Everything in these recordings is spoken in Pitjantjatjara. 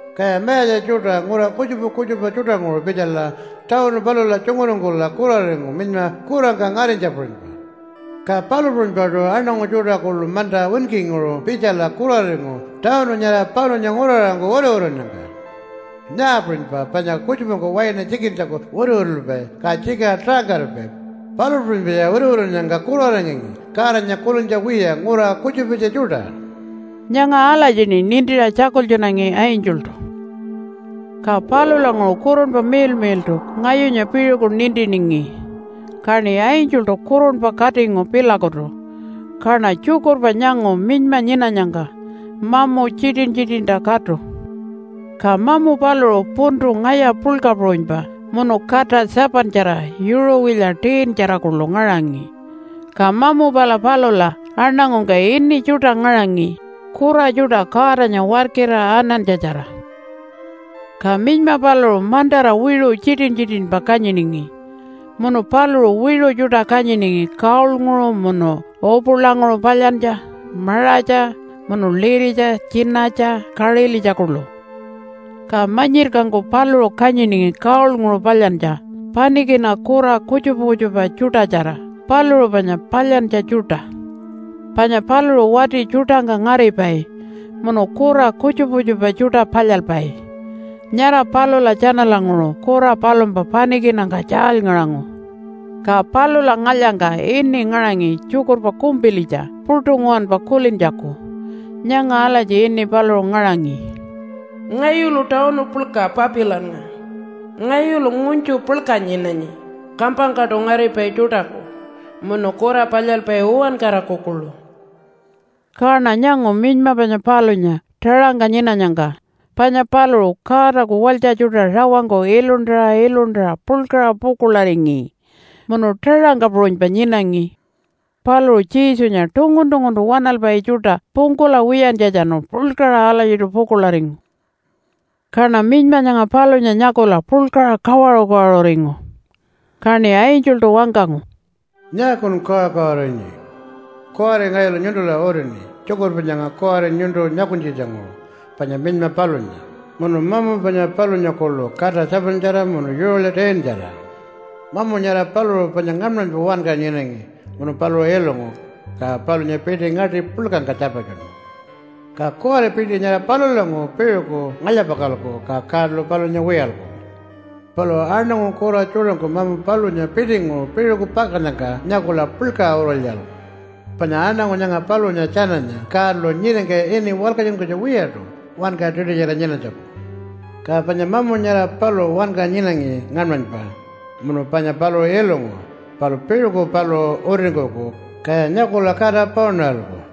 Kaya mayatja tjuṯa ngura kutjupa kutjupa tjuṯanguṟu pitjala tawunu palula tjunguringkula kuraringu minyma kurangka ngarinytja puṟunypa. Ka palu puṟunypaṯu aṉangu tjuṯa kuḻu manta winkinguṟu pitjala kuraringu tawunu nyara palunya nguraṟangku wituwitunnyangka. Nyaa puṟunypa, panya kutjupangku waina tjikintjaku wituwitulpai, ka tjikiṟa taṟangkaripai, palu puṟunypaya wituwitunnyangka kuraringangi Godanya kulintja wiya ngura kutjupitja tjuṯa.” Nyanga alatjiṉi nintiṟa tjakultjunangi angeltu. Ka palulanguṟu Kurunpa Miḻmiḻṯu ngayunya piṟuku nintiningi, kaṉi angeltu kurunpa katingu pilakutu. Kaṉa tjukurpa nyangu minyma nyinanyangka mamu tjitin-tjitinta katu. Ka mamu paluṟu puntu ngaya puḻka puṟunypa munu kata 7-tjara, yuṟuwilya 10-tjara kuḻu ngaṟangi. Ka mamu pala palula aṉangungka ini tjuṯa ngaṟangi kura tjuṯa Godanya warkira anantja-tjara. Ka minyma paluṟu mantara wiṟu tjitin-tjitinpa kanyiningi, munu paluṟu wiṟu tjuṯa kanyiningi gold-nguṟu munu upulanguṟu palyantja, maṟatja munu liritja, tjinatja, kaṟilitja kuḻu. Ka manyirkangku paluṟu kanyiningi gold-nguṟu palyantja panikina kura kutjupa kutjupa tjuṯatjara paluṟu panya palyantja tjuṯa. Panya paluṟu wati tjuṯangka ngaripai munu kura kutjupa kutjupa tjuṯa palyalpai. Nyara palula tjanalanguṟu kura palumpa panikinangka tjaalyngaṟangu. Ka palula ngalyangka ini ngaṟangi tjukurpa kumpilitja puṯu nguwanpa kulintjaku. Nyanga alatji ini paluṟu ngaṟangi, “Ngayulu tawunu puḻka Papilannga. Ngayulu ngunytju puḻka nyinanyi kampangkaṯu ngaripai tjuṯaku, munu kura palyalpai uwankaraku kuḻu.” Kaṉa nyangu minyma panya palunya taṟangka nyinanyangka. Panya paluṟu Godaku walytja tjuṯa rawangku iluntara iluntara puḻkaṟa pukuḻaringi, munu taṟangka puṟunypa nyinangi. Paluṟu Jesunya tungun-tunguntu waṉalpai tjuṯa pungkula wiyantjatjanu puḻkaṟa alatjiṯu pukuḻaringu. Kaṉa minyma nyanga palunya nyakula puḻkaṟa kawaṟu-kawaṟuringu. Kaṉi angeltu wangkangu, “Nyaakun kawaṟu-kawaṟurinyi? Kuwari ngayulu nyuntula utini tjukurpa nyanga kuwari nyuntu nyakunytjitjanguṟu panya minyma palunya, munu mamu panya palunya kuḻu kata 7-tjara munu yuṟuwilya 10-tjara. Mamu nyara paluṟu panya ngaṉmanypa wanka nyinangi munu paluṟu ilungu, ka palunya piṯi ngaṯi puḻkangka tjarpatjunu. Ka kuwari piṯi nyara palulanguṟu piṟuku ngalya-pakalku, ka Godalu palunya wiyalku. Palu aṉangu kura tjuṯangku mamu palunya piṯinguṟu piṟuku pakannyangka nyakula puḻkaṟa urulyaralku. Panya aṉangu nyanga palunya tjananya Godalu nyiringka ini walkatjunkunytja wiyaṯu wanka tiṯutjara nyinanytjaku. Ka panya mamu nyara paluṟu wanka nyinangi ngaṉmanypa munu panya paluṟu ilungu, palu piṟuku paluṟu utiringkuku, kaya nyakula kata paunaralku.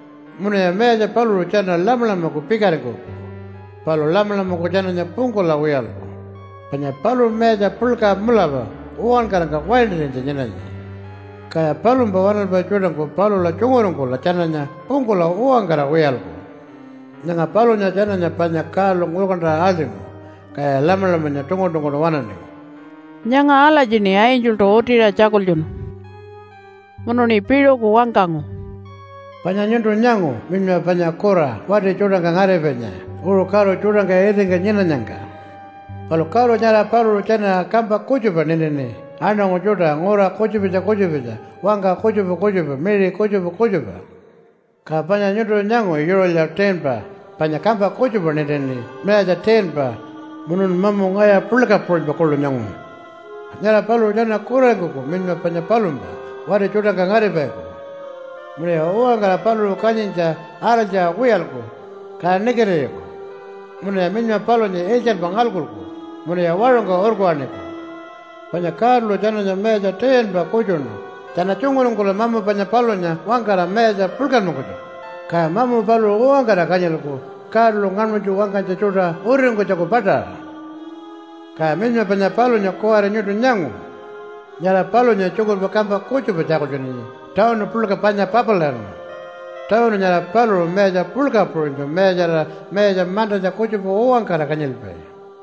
Munuya mayatja paluṟu tjana Lamalamaku pikaringkuku, palu Lamalamangku tjananya pungkula wiyalku, panya paluṟu mayatja puḻka mulapa uwankarangka waintarinytja nyinanyi. Kaya palumpa waṉalpai tjuṯangku palula tjunguringkula tjananya pungkula uwankara wiyalku. Nyanga palunya tjananya panya Godalu ngurkantaṟa aḻṯingu, kaya Lamalamanya tungun-tunguntu waṉaningi.” Nyanga alatjiṉi angeltu utiṟa tjakultjunu. Munuṉi piṟuku wangkangu, “Panya nyuntu nyangu minyma panya kura wati tjuṯangka ngaripainya uṟu karu tjuṯangka itingka nyinanyangka. Palu karu nyara paluṟu tjana kampa kutjupa nintini aṉangu tjuṯa ngura kutjupitja kutjupitja, wangka kutjupa kutjupa, miṟi kutjupa kutjupa. Ka panya nyuntu nyangu yuṟuwilya 10-pa panya kampa kutjupa nintini mayatja 10-pa, munun mamu ngaya puḻka puṟunypa kuḻu nyangu. Nyara paluṟu tjana kuraringkuku minyma panya palumpa wati tjuṯangka ngaripaiku. Munuya uwankara paluṟu kanyintja araltjaṟa wiyalku, ka nikitiriku. Munuya minyma palunya iltjanpa ngalkuku munuya waṟungka urkuwaṉiku. Panya Godalu tjananya mayatja 10-pa kutjuṉu tjana tjunguringkula mamu panya palunya wangkara mayatja puḻkanmankunytjaku, ka mamu paluṟu uwankara kanyilku Godalu ngaṉmanytju wangkanytja tjuṯa utiringkunytjaku paṯaṟa. “Ka minyma panya palunya kuwari nyuntu nyangu. Nyara palunya tjukurpa kampa kutjupa tjakultjunanyi tawunu puḻka panya Papilannga. Tawunu nyara paluṟu mayatja puḻka puṟunytju mayatjarira mayatja mantatja kutjupa uwankara kanyilpai.”